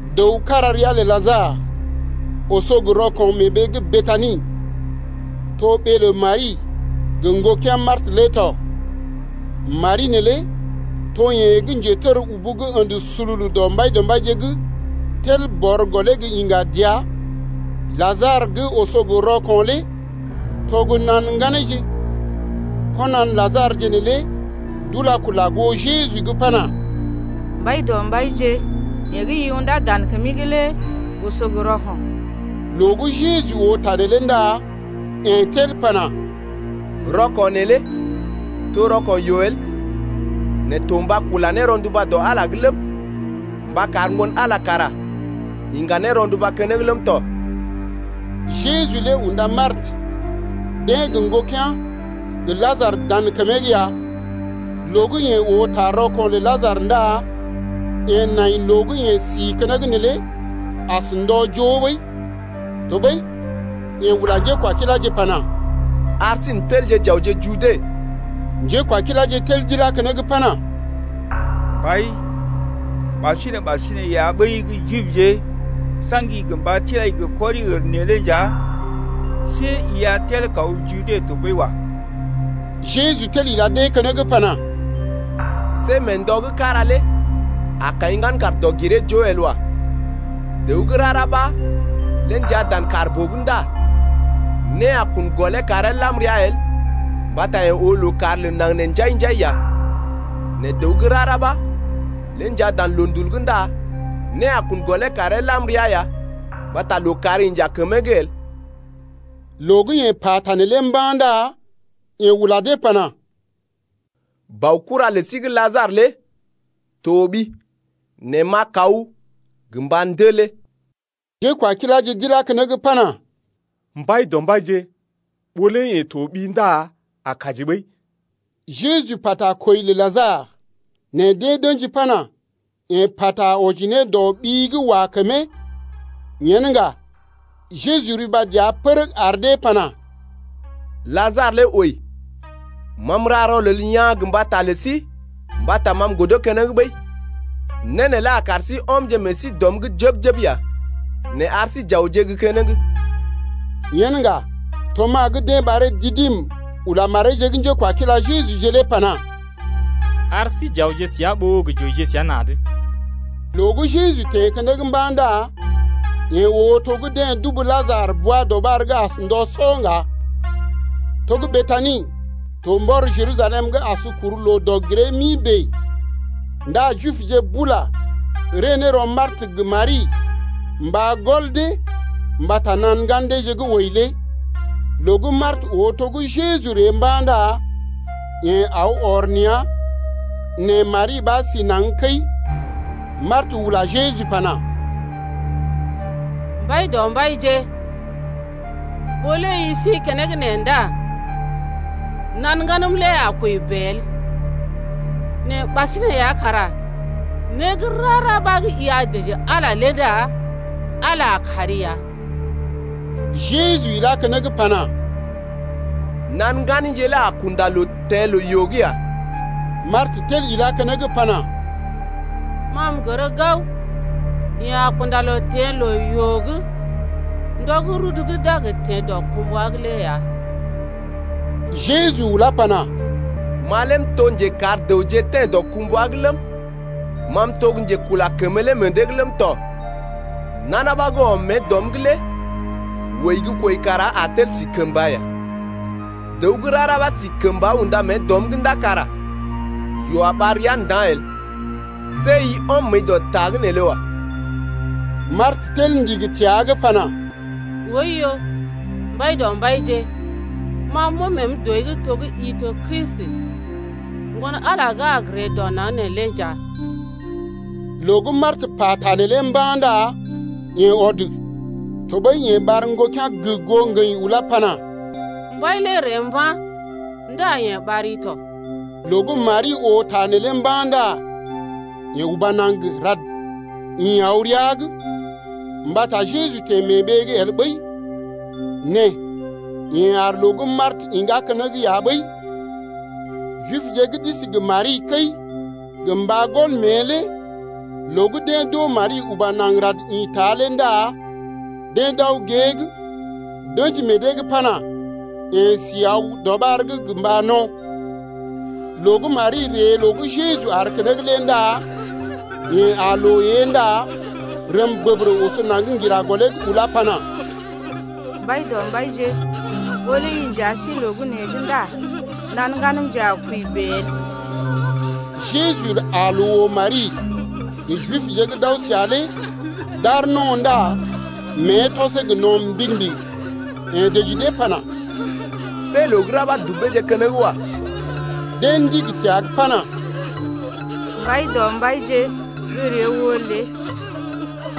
Dəw kára ria lə Lajarə oso gə rɔko̰ mee ɓee gə́ Betani, to ɓee lə Mari gə ŋgokea̰ Martə lé tɔ. Mari neelé to yeḛ gə́ njetər ubu gə́ ə̰də sululu dɔ Mbaidɔmbaije’g tel bɔr gɔlee gə iŋga dəa lé. Lajarə gə́ oso gə rɔko̰ lé to gə́ na̰ ŋganeeje. Konan Lajarəje neelé d’ula kula goo Jeju’g pana: Mbaidɔmbaije, yeḛ gə́ i undá dan kəmi’g lé oso gə rɔko̰. Loo gə́ Jeju oo ta neelé ndá yeḛ tel pana: Rɔko̰ neelé to rɔko̰ yoo el, nɛ to mba kula ne rɔnduba dɔ Ala’g lé ləm, mba kar Ŋgon-Ala lé kara iŋga ne rɔnduba keneŋ ləm tɔ. Jeju lé unda Martə deḛ gə ŋgokea̰ gə Lajarə lé dan kəmee’g ya. Loo gə́ yeḛ oo ta rɔko̰ lə Lajarə ndá yeḛ nai loo gə́ yeḛ si keneŋ neelé as ndɔ joo ɓəi. Tɔɓəi yeḛ ula njékwakiláje pana: Ar sí n’telje j’awje Jude. Njékwakiláje tel d’ilá keneŋ pana: Mbai, ɓasinè-ɓasinè ya ɓəi gə́ Jibje sa̰gi gə mba tilai gə kɔri-ər neelé nja see i a tel kaw Jude tɔɓəi wa. Jeju tel ila dee keneŋ pana: See mee ndɔ gə́ kára lé a kaḭ ŋgan kàr dɔg-giree-joo el wa. Dəw gə́ rara ɓa lé njaa dan kàr-boo’g ndá né a kun gɔlee karee lam rəa el mbata yeḛ oo lookàr lə naŋg nee njai-njai ya. Nɛ dəw gə́ rara ɓa lé njaa dan loondul’g ndá né a kun gɔlee karee lam ra ya mbata lookàr inja kəmee’g el. Loo gə́ yeḛ pata neelé mba̰ ndá yeḛ ula dee pana: Baokura lə sí gə́ Lajarə lé toɓi. Nɛ m’a kaw gə mba ndelee. Njékwakiláje d’ilá keneŋ pana: Mbaidɔmbaije, ɓó lé yeḛ toɓi ndá a kaji ɓəi. Jeju pata kwəi lə Lajarə, nɛ dee d’ə̰ji pana: Yeḛ pata wɔji ne dɔ ɓi gə́ wa kəmee. Yen ŋga Jeju riba dəa pərəg ar dee pana: Lajarə lé wəi. Ma m’ra rɔlel yaa̰ gə mbata lə sí mbata ma m’godo keneŋ ɓəi, né neelé a kar sí ɔmje ne meḛ sí dɔm’g jəb-jəb ya. Nɛ ar sí j’awje gə́ keneŋ. Yen ŋga Tomas gə́ dee ɓaree Didim ula mareeje gə́ njékwakila Jejuje lé pana: Ar sí j’awje səa ɓó gə j’wəije səa na̰’d. Loo gə́ Jeju teḛ keneŋ mba̰ ndá yeḛ oo to gə́ deḛ dubu Lajarə bwa-dɔɓar’g as ndɔ sɔ ŋga. To gə́ Betani to mbɔr Jerusalem’g as kuru loo dɔg-giree-mi bèe, ndá Jibje bula ree ne rɔ Martə gə Mari mba gɔl dee mbata nan-ŋgan deeje gə́ wəi lé. Loo gə́ Martə oo to gə́ Jeju ree mba̰ ndá yeḛ aw ɔr nea̰ nɛ Mari ɓa sí naŋg kəi. Martə ula Jeju pana: Mbaidɔmbaije, ɓó lé i sí keneŋ nee ndá nan ŋganm lé a kwəi bèe el. Nɛ ɓasinè ya kara né gə́ rara ɓa gə́ i a dəji Ala lé ndá Ala a kari ya. Jeju ilá keneŋ pana: Nan ŋganije lé a kunda loo teḛ loo-yoo’g ya. Martə tel ilá keneŋ pana: Ma m’gər gao yeḛ a kunda loo teḛ loo-yoo’g ndɔ gə́ rudu gə́ d’a gə teḛ dɔkumbwa’g lé ya. Jeju ulá pana: Ma lé m’to njekar dəwje teḛ dɔkumbwa’g ləm, ma m’to gə́ njekula kəmə lé meḛ dee’g ləm tɔ. Nana ɓa gə́ ɔm mée dɔm’g lé wəi gə́ kwəi kara a tel si kəmba ya. Dəw gə́ rara ɓa si kəmba unda mée dɔm’g ndá kara yoo a ɓar ria nda̰ el. See i ɔm məəi dɔ ta’g neelé wa. Martə tel ndigi təa’g pana: Oiyo Mbaidɔmbaije, ma m’ɔm məəm dɔi’g to gə́ i to Kristi, Ŋgon-Ala lé gə́ a gə ree dɔ naŋg neelé nja. Loo gə́ Martə pata neelé mba̰ ndá yeḛ ɔd. Tɔɓəi yeḛ ɓar ŋgokea̰ goo ŋgəḭ ulá pana: Mbai lé ree mba̰ ndá yeḛ ɓari tɔ. Loo gə́ Mari oo ta neelé mba̰ ndá yeḛ uba naŋg rad ḭ aw rəa’g. Mbata Jeju teḛ mee ɓee’g el ɓəi, nɛ yeḛ aar loo gə́ Martə iŋgá keneŋ ya ɓəi. Jibje gə́ d’isi gə Mari kəi gə mba gɔl mée lé loo gə́ deḛ d’oo Mari uba naŋg rad ḭta lé ndá deḛ d’aw gée’g d’ə̰ji meḛ dee’g pana: Yeḛ si aw gə́ dɔɓar’g gə mba no̰. Loo gə́ Mari ree loo gə́ Jeju aar keneŋ lé ndá yeḛ aa loo ée ndá rəm bəbərə oso naŋg ŋgira gɔlee’g ulá pana: Mbaidɔmbaije, ɓó lé i nja si loo gə́ nee’g ndá nan ŋganəmje a kwəi bèe el. Jeju aa loo oo Mari gə Jibje gə́ d’aw səa lé d’aar no̰ ndá mée tɔsee gə no̰ mbigi-mbigi. Yeḛ dəji dee pana: See loo gə́ ra ɓa dubeeje keneŋ wa. Deḛ ndigi təa’g pana: Mbaidɔmbaije, gə́ ree oo lé.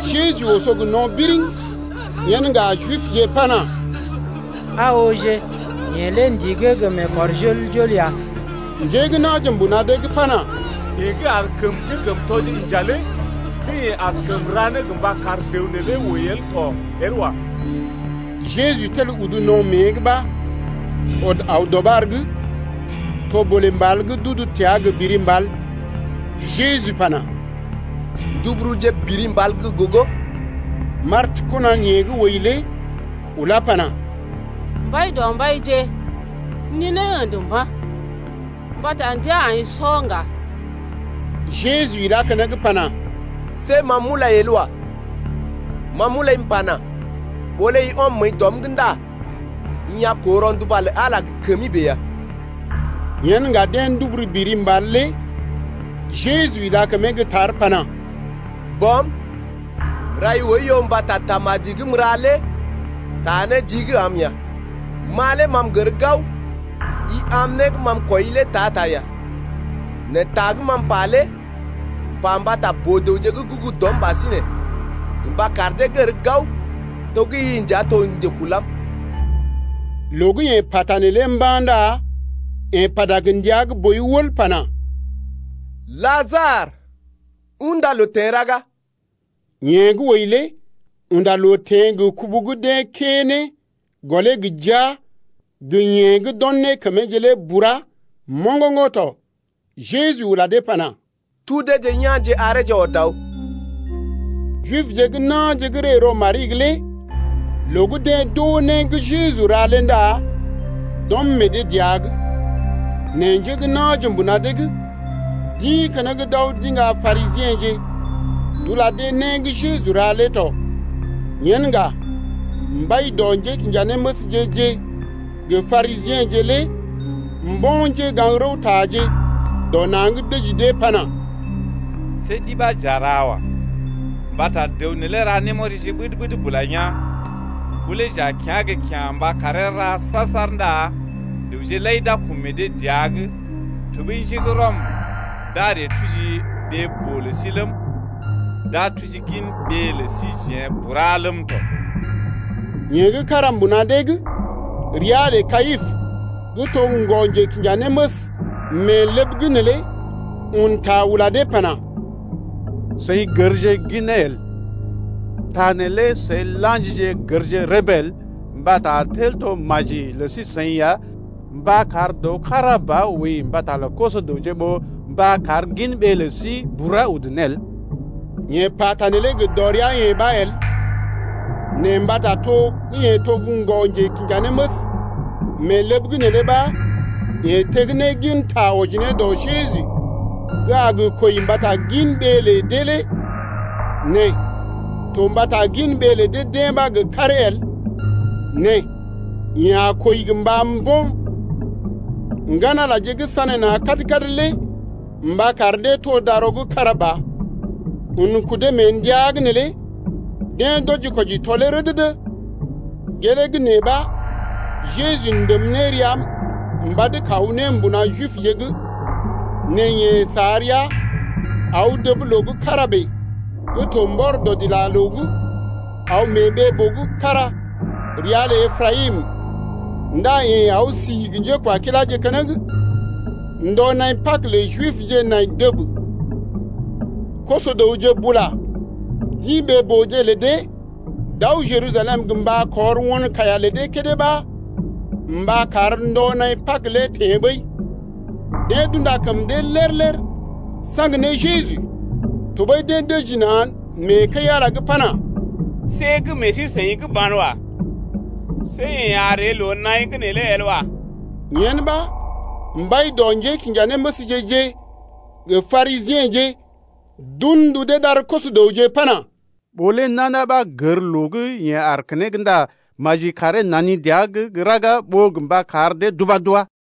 Jeju oso gə no̰ biriŋ. Yen ŋga Jibje pana: Aa ooje, yeḛ lé ndigee gə mee kɔr jol-jol ya. Njé gə́ na̰je mbuna dee’g pana, Yeḛ gə́ ar kəm njékəmtɔje inja lé see yeḛ askəm ra né gə mba kar dəw neelé wəi el to el wa. Jeju tel udu no̰ mée’g ɓa ɔd aw dɔɓar’g. To bolè mbal gə́ d’udu təa gə biri mbal. Jeju pana: Nduburuje biri mbal gə́ gogo. Martə kɔnan yeḛ gə́ wəi lé ulá pana: Mbaidɔmbaije, ninee ə̰də mba̰, mbata ndəa aḭ sɔ ŋga. Jeju ilá keneŋ pana: See ma m’ulai el wa, ma m’ulai m’pana: Ɓó lé i ɔm məəi dɔm’g ndá i a koo rɔnduba lə Ala lé gə kəmi bèe ya. Yen ŋga deḛ nduburu biri mbal lé. Jeju ila kəmee gə́ tar pana: Bɔm, m’rai oiyo mbata tamaji gə́ m’ra lé taa né jii’g am ya. Ma lé ma m’gər gao i am né gə́ ma m’kwɔii lé ta-ta ya, nɛ ta gə́ ma m’pa lé m’pa mbata boo-dəwje gə́ gugu dɔm ɓasinè gə mba kar dee gər gao to gə́ i nja to gə́ njekulam. Loo gə́ yeḛ pata neelé mba̰ ndá yeḛ pata gə ndia gə́ boi wəl pana: Lajarə, unda loo teḛ raga! Yeḛ gə́ wəi lé unda loo teḛ gə kubu gə́ deḛ kə́ ne gɔlee gə jia gə yeḛ gə́ d’o̰ ne kəmeeje lé bura moŋgoŋgo̰ tɔ. Jeju ula dee pana: Tudeje yá̰je areeje ɔd aw. Jibje gə́ na̰je gə́ ree rɔ Mari’g lé loo gə́ deḛ d’oo né gə́ Jeju ra lé ndá d’ɔm meḛ dee dəa’g. Nɛ njé gə́ na̰je mbuna dee’g d’ḭ keneŋ d’aw d’iŋga Parisiḛje d’ula dee né gə́ Jeju ra lé tɔ. Yen ŋga mbai dɔ njékinjanéməsje-je gə Parisiḛje lé mbo̰ njégaŋ-rəwtaje dɔ na̰’d dəji dee pana: See ɗi ɓa j’a ra wa. Mbata dəw neelé ra némɔrije ɓəd-ɓəd bula yaa̰. Ɓó lé jeḛ j’yá̰ gə́ kyá̰ mba karee ra saar-saar ndá dəwje lai d’a kɔm meḛ dee dəa’g. Tɔɓəi njé gə́ Rɔm d’a ree tuji ɓee-boo lə sí ləm, d’a tuji gin ɓee lə síjeḛ bura ləm tɔ. Yeḛ gə́ kára mbuna dee’g ria lə Kayipə gə́ to ŋgɔ-njekinjanéməs mee ləb’g neelé un ta ula dee pana: Seḭ gərje gin né el. Ta neelé seḭ la̰jije gərje rəbee el mbata a tel to maji lə sí-seḭ ya mba kar dəw kára ba wəi mbata lə koso-dəwje ɓó mba kar gin ɓee lə sí bura udu ne el. Yeḛ pata neelé gə dɔrea-yeḛ ɓa el, nɛ mbata to gə́ yeḛ to ŋgɔ-njekinjanéməs mee ləb’g neelé ɓa yeḛ teg ne gin ta wɔji ne dɔ Jeju gə́ a gə kwəi mbata lə gin ɓee lə dee lé. Nɛ to mbata gin ɓee lə dee ɓa gə karee el, nɛ yeḛ a kwəi gə mba mbo̰ ŋgan-Alaje gə́ sanéna̰ kad-kad lé mba kar dee to darɔ gə́ kára ba. Un kudee mee ndəa’g neelé deḛ d’wɔji-kwɔji tɔlee rədədə. Gelee gə́ nee ɓa Jeju ndèm ne rəa mbad kaw ne mbuna Jibje’g. Nɛ yeḛ sa rəa aw dəb loo gə́ kára bèe gə́ to mbɔr dɔdilaloo’g aw mee ɓee-boo gə́ kára ria lə Eprayim. Ndá yeḛ aw si gə njékwakiláje keneŋ. Ndɔ naḭ Pag lə Jibje nai dəb. Koso-dəwje bula d’ḭ ɓee-booje lə dee d’aw Jerusalem gə mba kɔr won kaiya lə dee kédé ɓa mba kar ndɔ naḭ Pag lé teḛ ɓəi. Deḛ d’unda kəm dee lér-lér saŋg ne Jeju tɔɓəi deḛ dəji na̰ mee kəi-Ala’g pana: See gə́ meḛ sí-seḭ’g banwa. See yeḛ a ree loo-naḭ’g neelé el wa. Yen ɓa mbai dɔ njékinjanéməsje-je gə Parisiḛje d’un ndu dee d’ar koso-dəwje pana: Ɓó lé nana ɓa gər loo gə́ yeḛ aar keneŋ ndá maji karee nani dəa gə́ raga ɓó gə mba kar dee d’ubá d’wá.